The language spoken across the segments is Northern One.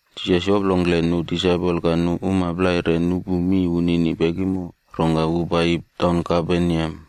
Jisas yoplongkle nu disaipol ka nu uma plai re nupu mi wunini pekimo, rongka wu paiyi taun Kaperneam.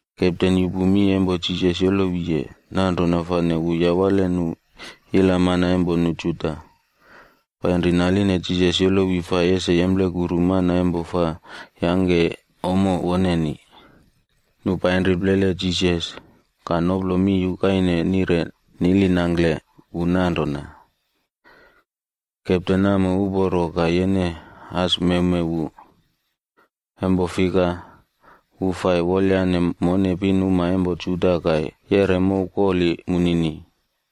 Kepten yupu mi empo Jisas yolowiye, nanrona fane wu yawale nu ilamana empo nu Juda, painri naline Jisas yolowi fai ese yemplekuru mana fai yangke ommo woneni. Nu painri plele Jisas, ka noplo mi yukaine nire nilinangkle wu nanrona, “Kepten namo uporo ka yene as mewmew wu, empo fika, wu fai wolyane mone pinuma empo Juda ka yeꞌre mow koli munini.”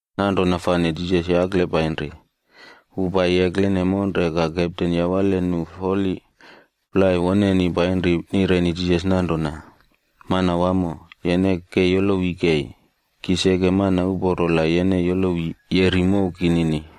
Nanrona fane Jisas yakle painri. Wu paiyi eklene monre ka kepten yawale nu foli plai woneni painri nireni Jisas nanrona, “Manawamo, yene ke yolowi kei. Ki seke mana uporo la yene yolowi yeri mow kinini.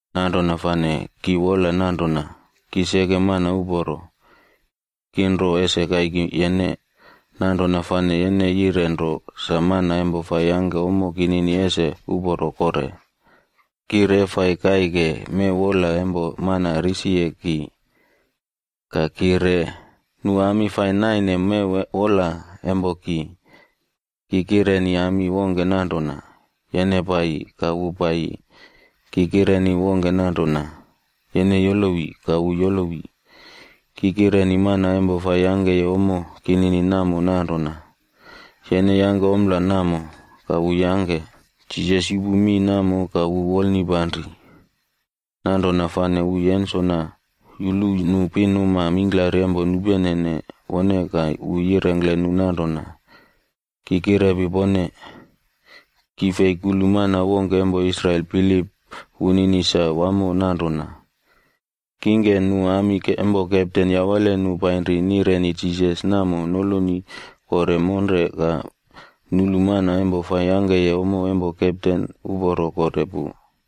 Nanrona fane ki wola nanrona, ki seke mana uporo, ki nro ese kaiki yene. Nanrona fane yene yire nro sa mana empo fai yangke ommo kinini ese uporo kore. Ki re fai kaike mew wola empo mana risiye ki. Ka ki re, nu ami fai naine mew wola empo ki. Ki kireni ami wongke nanrona, ‘Yene paiyi,’ ka wu paiyi. Ki kireni wongke nanrona, ‘Yene yolowi,’ ka wu yolowi. Ki kireni mana fai yangkeye ommo kinini namo nanrona, ‘Yene yangke ompla namo,’ ka wu yangke.” Jisas yupu mi namo ka wu wolnipanri, nanrona fane wu yensona yulu nu pinuma mingklari empo nupenene wone ka wu yirengkle nu nanrona, “Ki kirepi pone, ki fei kulu mana wongke empo Israel bilip wunini sa wamo nanrona.” Kingke, nu uma empo kepten yawale nu painri nireni Jisas namo noloni kore monre ka nulu mana fai yangkeye ommo empo kepten uporo kore pu.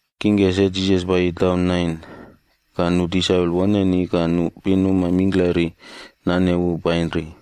Kingke se Jisas paiyi taun Nain, ka nu disaipol woneni ka nu pinuma mingklari nane wu painri.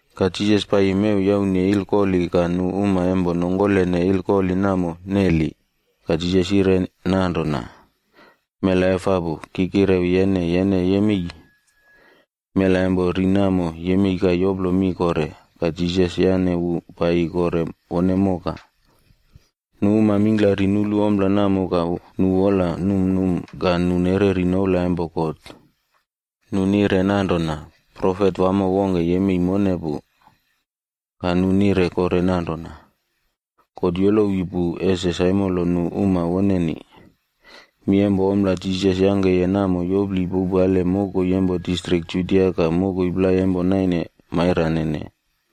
Ka Jisas paiyi mew yaune ilkoli ka nu uma empo nongkolene ilkoli namo neli. Ka Jisas yire nanrona, “Mela efapu, ki kirewi yene, yene yemei!” Mela empo ri namo, yemei ka yoplo mi kore. Ka Jisas yane wu paiyi kore wone moka. Nu uma mingklari nulu ompla namo ka nu wola numnum ka nu nereri noula empo God. Nu nire nanrona, “Profet wamo wongke yemei mone pu.” Ka nu nire kore nanrona, “God yolowi pu ese saimolo nu uma woneni.” Mi empo ompla Jisas yangkeye namo yopli powpale mokoi empo distrik Judia ka mokoi plai empo naine mairanene.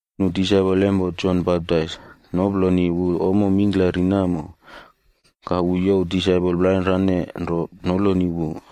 Nu disaipol empo Jon Baptaisb noploni wu ommo mingklari namo, ka wu youw disaipol plainrane nro noloni wu.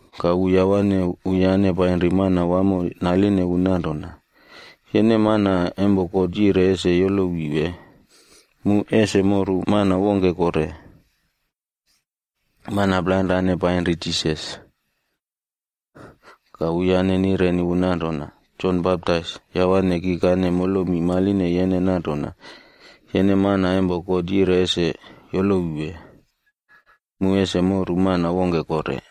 Ka wu yawane wuyane painri Manawamoka naline wu nanrona, “Yene mana empo God yire ese yolowi wee, mu ese moru mana wongke kore?” Mana plainrane painri Jisas, ka wuyane nireni wu nanrona, “Jon Baptais yawane kikane molomi maline yene nanrona, ‘Yene mana empo God yire ese yolowi wee, mu ese moru mana wongke kore?’”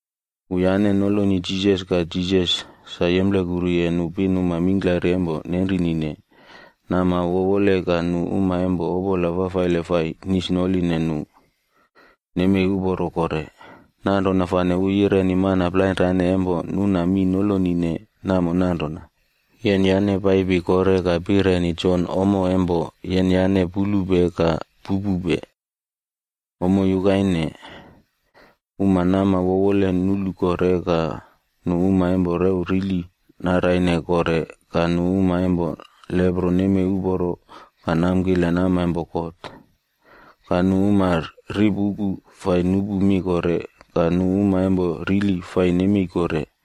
Wuyane noloni Jisas, ka Jisas sa yemplekuruye nu pinuma mingklari empo nenrinine, nama wowole ka nu uma empo opola fafaile fai nisnoline nu, nemei uporo kore. Nanrona fane wu yireni mana plainrane empo nuna mi nolonine namo nanrona, “Yenyane paipi kore ka pireni Jon ommo empo yenyane pulupe ka pupupe. Ommo yukaine: Uma nama wowole nulu kore, ka nu uma empo rew rili naraine kore, ka nu uma empo lepro nemei uporo ka namkile nama empo God,c ka nu uma ripuku fai nupu mi kore, ka nu uma empo rili fai nemei kore,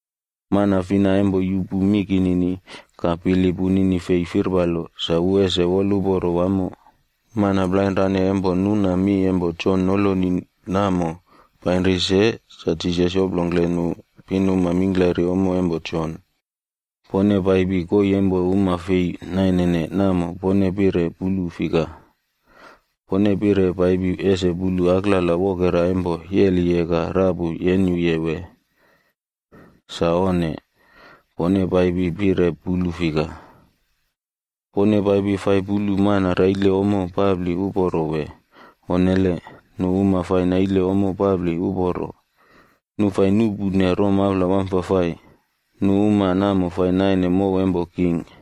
Mana fina empo yupu mi kinini, ka bilip wunini fei firpalo, sa wu ese aiyem wamo.” Mana plainrane empo nuna mi empo Jon noloni namo painri se, sa Jisas yoplongkle nu pinuma mingklari ommo empo Jon, “Pone paipi koii empo uma fei nainene namo pone pire pulu fika? Pone pire paipi ese pulu aklala wokera empo yeliye ka rapu yenyuye wee? Sa onne, pone paipi pire pulu fika? Pone paipi fai pulu mana raile ommo papli uporo, wee? Onnele. Nu uma fai naile ommo papli uporo, nu fai nuꞌpune romaula wamfafai, nu uma namo fai naine mow empo king.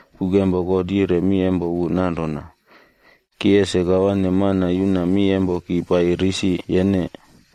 Buk empo God yire mi empo wu nanrona, ‘Ki ese kawane mana yuna mi empo ki paiyi risi yene,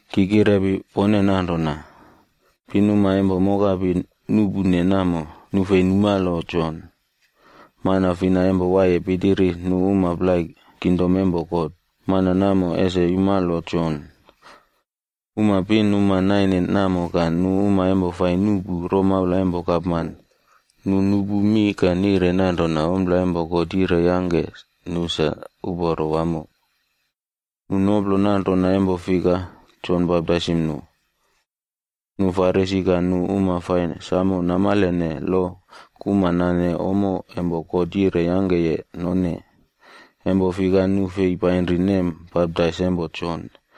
Ki kirepi pone nanrona, pinuma empo mokapi nuꞌpune namo, nu fei rikepone Jon. Mana fina empo waiye pitiri nu uma plai kingdom empo God, mana namo ese yumalo Jon.” Uma pinuma naine namo ka nu uma empo fai nuꞌpu romaula empo gapman, nu nupu mi ka nire nanrona ompla empo God yire yangke nu sa uporo wamo. Nu noplo nanrona, empo fika Jon baptaisim nu. Nu Farisi ka nu uma fai samo namalene lo kuma nane ommo empo God yire yangkeye none, empo fika nu fei painri nem baptais empo Jon.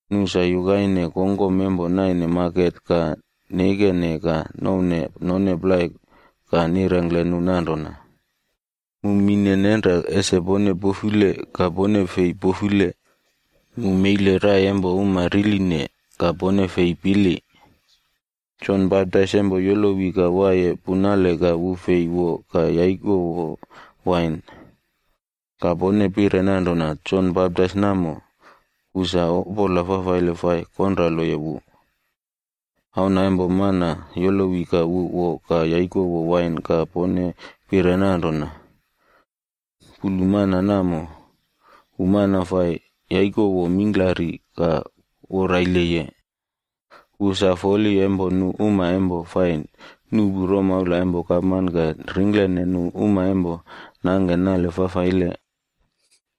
Nu sa yukaine kongkom empo naine maket ka neikene ka nouwne none plai ka nirengkle nu nanrona, ‘Mu mine nenra ese pone pofule ka pone fei pofule, mu meile rai empo uma riline, ka pone fei pili.’ Jon Baptais empo yolowi ka waiye punale ka wu fei wo ka yaikowo wain, ka pone pire nanrona, ‘Jon Baptais namo, wu sa opola fafaile fai konraloye wu.’ Auna empo Mana yolowi ka wu wo ka yaikowo wain ka pone pire nanrona, ‘Pulu mana namo, wu mana fai yaikowo mingklari ka woraileye. Wu sa foli empo nu uma empo fai nuꞌpu romaula empo gapman ka ringklene nu uma empo nangke nale fafaile.’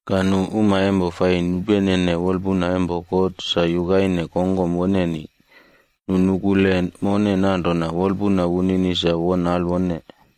Ka nu uma empo fai nupenene wolpuna empo God sa yukaine kongkom woneni, nu nukule mone nanrona wolpuna wunini sa won alwone.”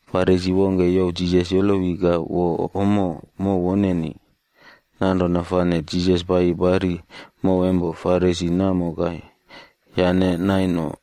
Farisi wongke yaline Jisas ese yolowi ka wo ommo mow woneni. Nanrona fane Jisas paiyi pari mow empo Farisi namo ka yane nai no.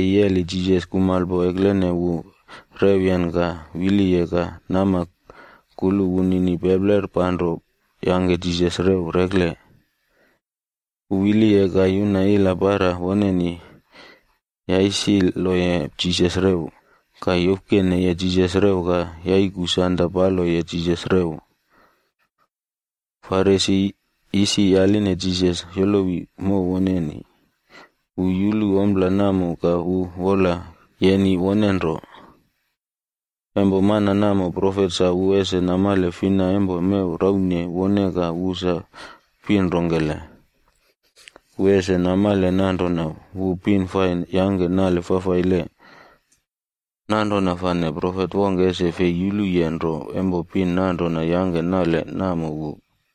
Wu paiyi yeli Jisas kumalpo eklene wu rewyen ka wiliye ka nama kulu wunini pepler panro yangke Jisas rew rekle. Wu wiliye ka yuna ila para woneni yasiloye Jisas rew, ka yofkeneye Jisas rew ka yaiku sanda paloye Jisas rew. Farisi isi yaline Jisas yolowi mow woneni, wu yulu ompla namo ka wu wola yeni wone nro, “La mana namo profet sa wu ese namale fina empo mew raune wone ka wu sa pin rongkele. Wu ese namale nanrona wu pin fai yangke nale fafaile. Nanrona fane profet wongke ese fei yuluye nro empo pin nanrona yangke nale namo wu.”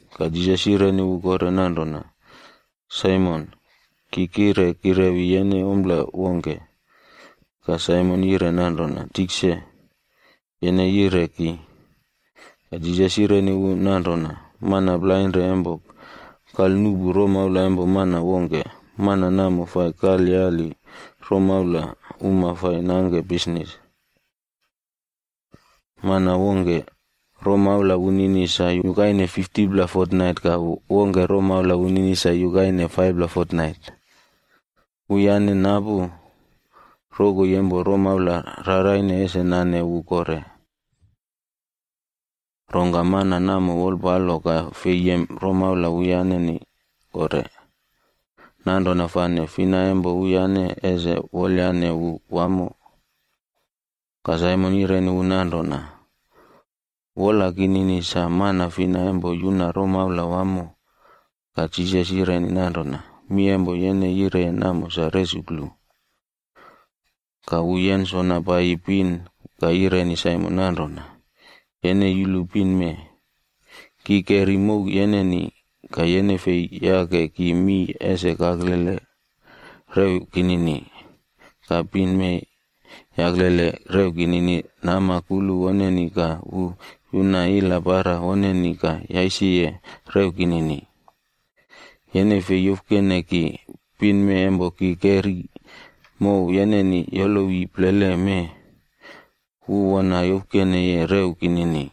Ka Jisas yireni wu kore nanrona, “Saimon, ki kire kirewi yene ompla wongke.” Ka Saimon yire nanrona, “Tikse, yene yire ki.” Ka Jisas yireni wu nanrona, “Mana plainre empo kalnuꞌpu romaula empo mana wongke, mana namo fai kalyali romaula uma fai nangke bisnis. Mana wongke, romaula wunini sa yukaine 50pla fotnait ka mana wongke romaula wunini sa yukaine 5pla fotnait. Wuyane napu rokoi empo romaula raraine ese nane wu kore. Rongka mana namo wolpalo ka fei yem romaula wuyaneni kore. Nanrona fane fina empo wuyane ese wolyane wu wamo?” Ka Saimon yireni wu nanrona, “Wola kinini sa mana fina empo yuna romaula wamo.” Ka Jisas yire nanrona, “Mi empo yene yireye namo sa resuklu.” Ka wu yensona paiyi pin ka yireni Saimon nanrona, “Yene yulu pin mee? Ki keri mow yeneni, ka yene fei yake ki mii ese kaklele rew kinini, ka pin mee yaklele rew kinini nama kulu woneni ka wu yuna ila para woneni ka yasiye rew kinini. Yene fei yofkene ki, pin mee empo ki keri mow yeneni yolowi plele mee, wu wona yofkeneye rew kinini.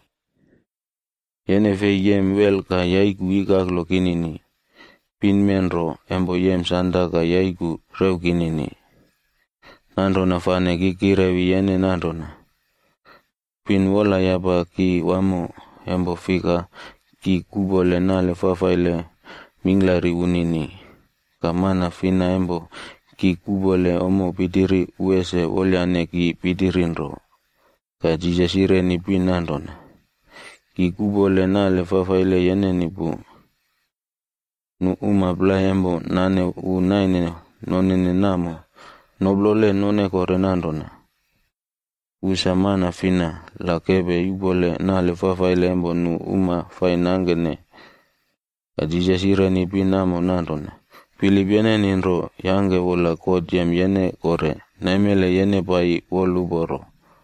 Yene fei yem wel ka yaiku ikaklo kinini, pin mee nro empo yem sanda ka yaiku rew kinini. Nanrona fane ki kirewi yene nanrona, pin wolayapa ki wamo, empo fika ki kuꞌpole nale fafaile mingklari wunini. Ka mana fina empo ki kuꞌpole ommo pitiri, wu ese wolyane ki pitiri nro.” Ka Jisas yireni pin nanrona, “Ki kuꞌpole nale fafaile yeneni pu.” Nu uma plai empo nane wu naine nonene namo, noplole none kore nanrona, “Wu sa mana fina la kepe yuꞌpole nale fafaile empo nu uma fai nangkene?” Ka Jisas yireni pin namo nanrona, “Bilip yeneni nro yangke wola God yem yene kore; naimele yene paiyi plau woluporo.”